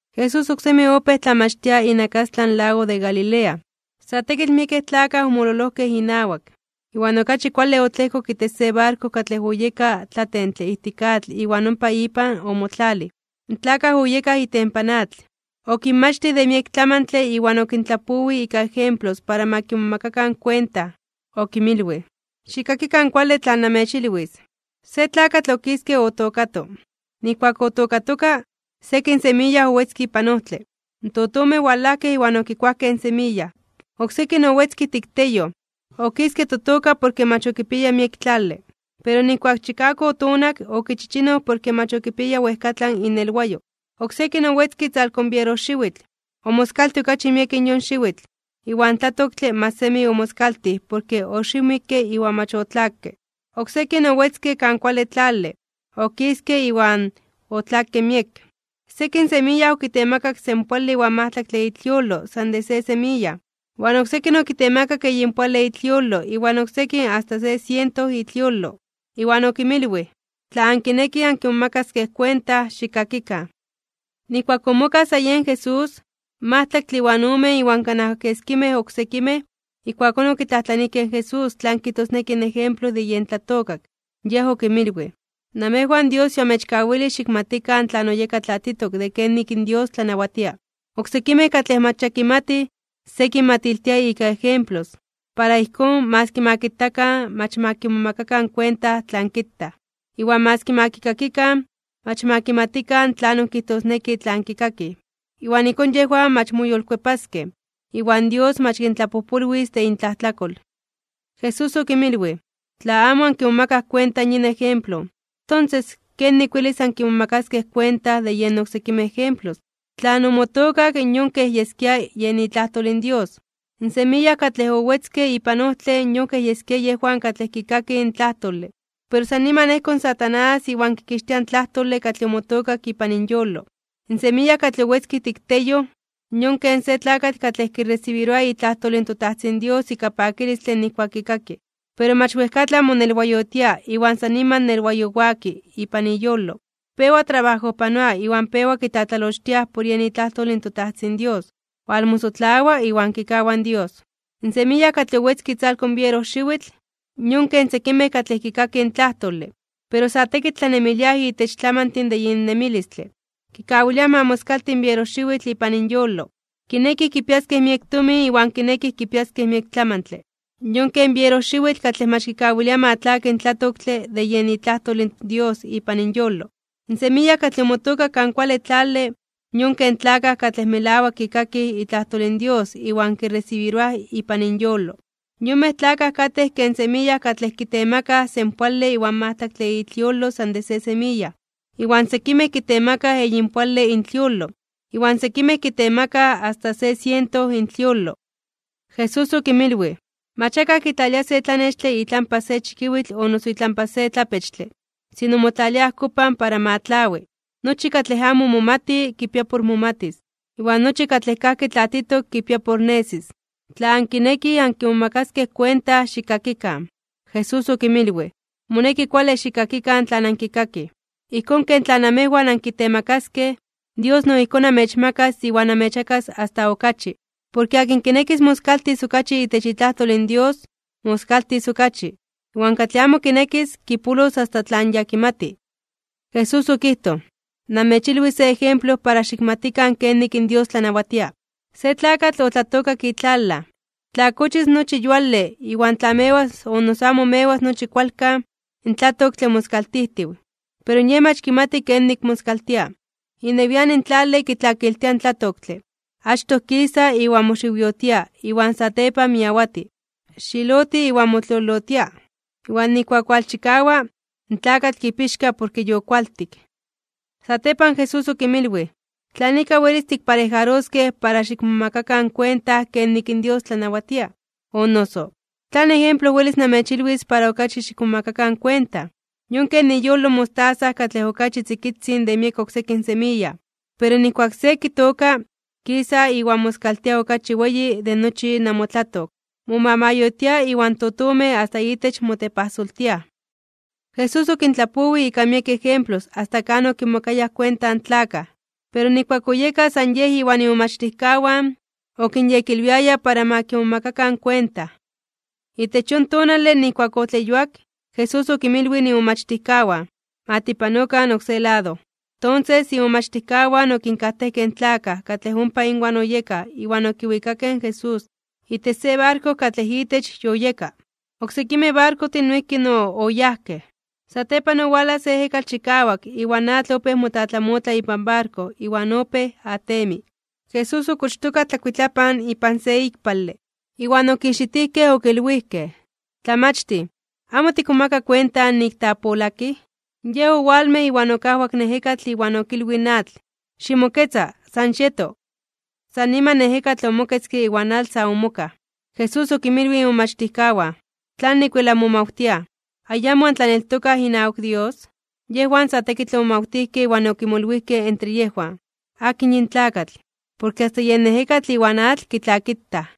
Jesús oksemi opéj tlamachtia inakastlan lago de Galilea. Sa tekitl miekej tlakaj omololojkej inawak, iwan okachi kuale otlejkok itech se barko katlej oyeka tlatentle ijtik atl iwan ompa ipan omotlalij. In tlakaj oyekaj itempan atl. Okinmachtij de miek tlamantle iwan okintlapowij ika ejemplos para ma kimomakakan kuenta. Okinmilwij: ―¡Xikkakikan kuale tlan namechilwis! Se tlakatl okiske otookato. Nijkuak otookatoka, sekin semiya owetzke ipan ojtle. In totomej owalajkej iwan okikuajkej in semiya. Oksekin owetzke ijtik teyoj, okiske totoka porke mach okipiaya miek tlale. Pero nijkuak chikawak otonak, okichichinoj porke mach okipiaya wejkatlan inelwayo. Oksekin owetzke itzalko in bierojxiwitl, omoskaltij okachi miek yon xiwitl, iwan tlatoktle mach semi omoskaltij porke oxiwmikke iwan mach otlakke. Oksekin owetzke kan kuale tlale, okiske iwan otlakke miek. Sekin semiya okitemakak senpoale iwan majtlaktle itliolo san de se semiya, iwan oksekin okitemakak eyinpoale itliolo iwan oksekin asta se siento itliolo. Iwan okinmilwij: ―Tla ankinekij ankimomakaskej kuenta, xikkakikan. Nijkuak omokaj sa yen Jesús, in majtlaktle iwan omen iwan kanaj keskimej oksekimej, ijkuakón okitlajtlanijkej in Jesús tlan kijtosneki in ejemplo de yen tlatookak. Yej okinmilwij: ―Namejwan Dios yoamechkawilij xikmatikan tlan oyeka tlatitok de kenik in Dios tlanawatia. Oksekimej katlej mach ya kimatij, se kinmatiltia ika ejemplos. Para ijkón, maski ma kitakan, mach ma kimomakakan kuenta tlan kitaj. Iwan maski ma kikakikan, mach ma kimatikan tlanon kijtosneki tlan kikakij. Iwan ijkón yejwan mach moyolkuepaskej, iwan Dios mach kintlapojpolwis de intlajtlakol. Jesús okinmilwij: ―Tla amo ankimomakaj kuenta yin ejemplo, tonses ¿kenik welis ankimomakaskej kuenta de yen oksekimej ejemplos? Tlan omotookak yon kej yeskia yen itlajtol in Dios. In semiya katlej owetzke ipan ojtle yon kej yeskia yejwan katlej kikakij in tlajtole, pero san niman ejko in Satanás iwan kikixtia in tlajtole katlej omotookak ipan inyolo. In semiya katlej owetzke ijtik teyoj, yon ken se tlakatl katlej kiresibiroa itlajtol in toTajtzin Dios ika pakilistle nijkuak kikaki. Pero mach wejkatlan monelwayotia iwan san niman nelwayowaki ipan iyolo. Pewa trabajojpanoa iwan pewa kitlatlalochtiaj por yen itlajtol in toTajtzin Dios, walmosotlawa iwan kikawa in Dios. In semiya katlej owetzke itzalko in bierojxiwitl, yon ken sekimej katlej kikakij in tlajtole, pero sa tekitl tlanemiliaj itech tlamantin de yin nemilistle, kawiliaj ma moskalti in bierojxiwitl ipan inyolo. Kinekij kipiaskej miek tomin iwan kinekij kipiaskej miek tlamantle, yon ken bierojxiwitl katlej mach kikawilia ma tlaki in tlatoktle de yen itlajtol in Dios ipan inyolo. In semiya katlej omotookak kan kuale tlale, yon ken tlakaj katlej melawak kikakij itlajtol in Dios iwan kiresibiroaj ipan inyolo. Yonmej tlakaj katej ken semiya katlej kitemakaj senpoale iwan majtlaktle intliolo san de se semiya, iwan sekimej kitemakaj eyinpoale intliolo, iwan sekimej kitemakaj asta se siento intliolo. Jesús okinmilwij: ―Mach akaj kitlalia se tlanextle itlampa se chikiwitl o noso itlampa se tlapechtle. Sino motlalia ajkopan para ma tlawi. Nochi katlej amo momati kipia por momatis, iwan nochi katlej kajki tlatitok kipia por nesis. Tla ankinekij ankimomakaskej kuenta, xikkakikan. Jesús okinmilwij: ―Moneki kuale xikkakikan tlan ankikakij. Ijkón ken tlan namejwan ankitemakaskej, Dios no ijkón amechmakas iwan amechmakas asta okachi. Porke akin kinekis moskaltis okachi itech itlajtol in Dios, moskaltis okachi. Iwan katlej amo kinekis, kipolos asta tlan ya kimati. Jesús okijtoj: ―Namechilwis se ejemplo para xikmatikan kenik in Dios tlanawatia: se tlakatl otlatookak itlalaj. Tla kochis nochi yuale iwan tla mewas o noso amo mewas nochi kualkan, in tlatoktle moskaltijtiw, pero yej mach kimati kenik moskaltia, inewian in tlale kitlakiltia in tlatoktle, achtoj kisa iwan moxiwyotia iwan satepan miawati, xiloti iwan motliolotia. Iwan nijkuak walchikawa, in tlakatl kipixka porke yokualtik. Satepan Jesús okinmilwij: ―¿Tlan ika welis tikparejaroskej para xikmomakakan kuenta kenik in Dios tlanawatia? O noso, ¿tlan ejemplo welis namechilwis para okachi xikmomakakan kuenta? Yon ken iyolo mostaza, katlej okachi tzikitzin de miek oksekin semiya. Pero nijkuak se kitooka, kisa iwan moskaltia okachi weyi de nochi namotlatok. Momamayotia iwan totomej asta itech motepajsoltiaj. Jesús okintlapowij ika miek ejemplos asta kan okimomakayaj kuenta in tlakaj. Pero nijkuak oyeka san Yej iwan imomachtijkawan, okinyekilwiaya para ma kimomakakan kuenta. Itech yon tonale nijkuak otleyuak, Jesús okinmilwij imomachtijkawan: ―Ma tipanokan oksé lado. Tonses, imomachtijkawan okinkajtejkej in tlakaj katlej ompa inwan oyekaj iwan okiwikakej in Jesús itech se barko katlej itech yoyeka. Oksekimej barkojtin noijki no oyajkej. Satepan owalaj se ejekatl chikawak iwan atl opéj motlamotla ipan barko iwan opéj atemi. Jesús okochtoka tlakuitlapan ipan se ikpale. Iwan okijxitijkej okilwijkej: ―¡Tlamachtij! ¿Amo tikmomaka kuenta nik tiapolakij? Yej owalmej iwan okajwak in ejekatl iwan okilwij in atl: ―¡Ximoketza! ¡San xieto! San niman in ejekatl omoketzke iwan atl sa omokaj. Jesús okinmilwij imomachtijkawan: ―¿Tlanik wel anmomawtiaj? ¿Ayamo antlaneltokaj inawak Dios? Yejwan sa tekitl omomawtijkej iwan okimolwijkej entre yejwan: ―¿Akin Yin tlakatl, porke asta yen ejekatl iwan atl kitlakitaj?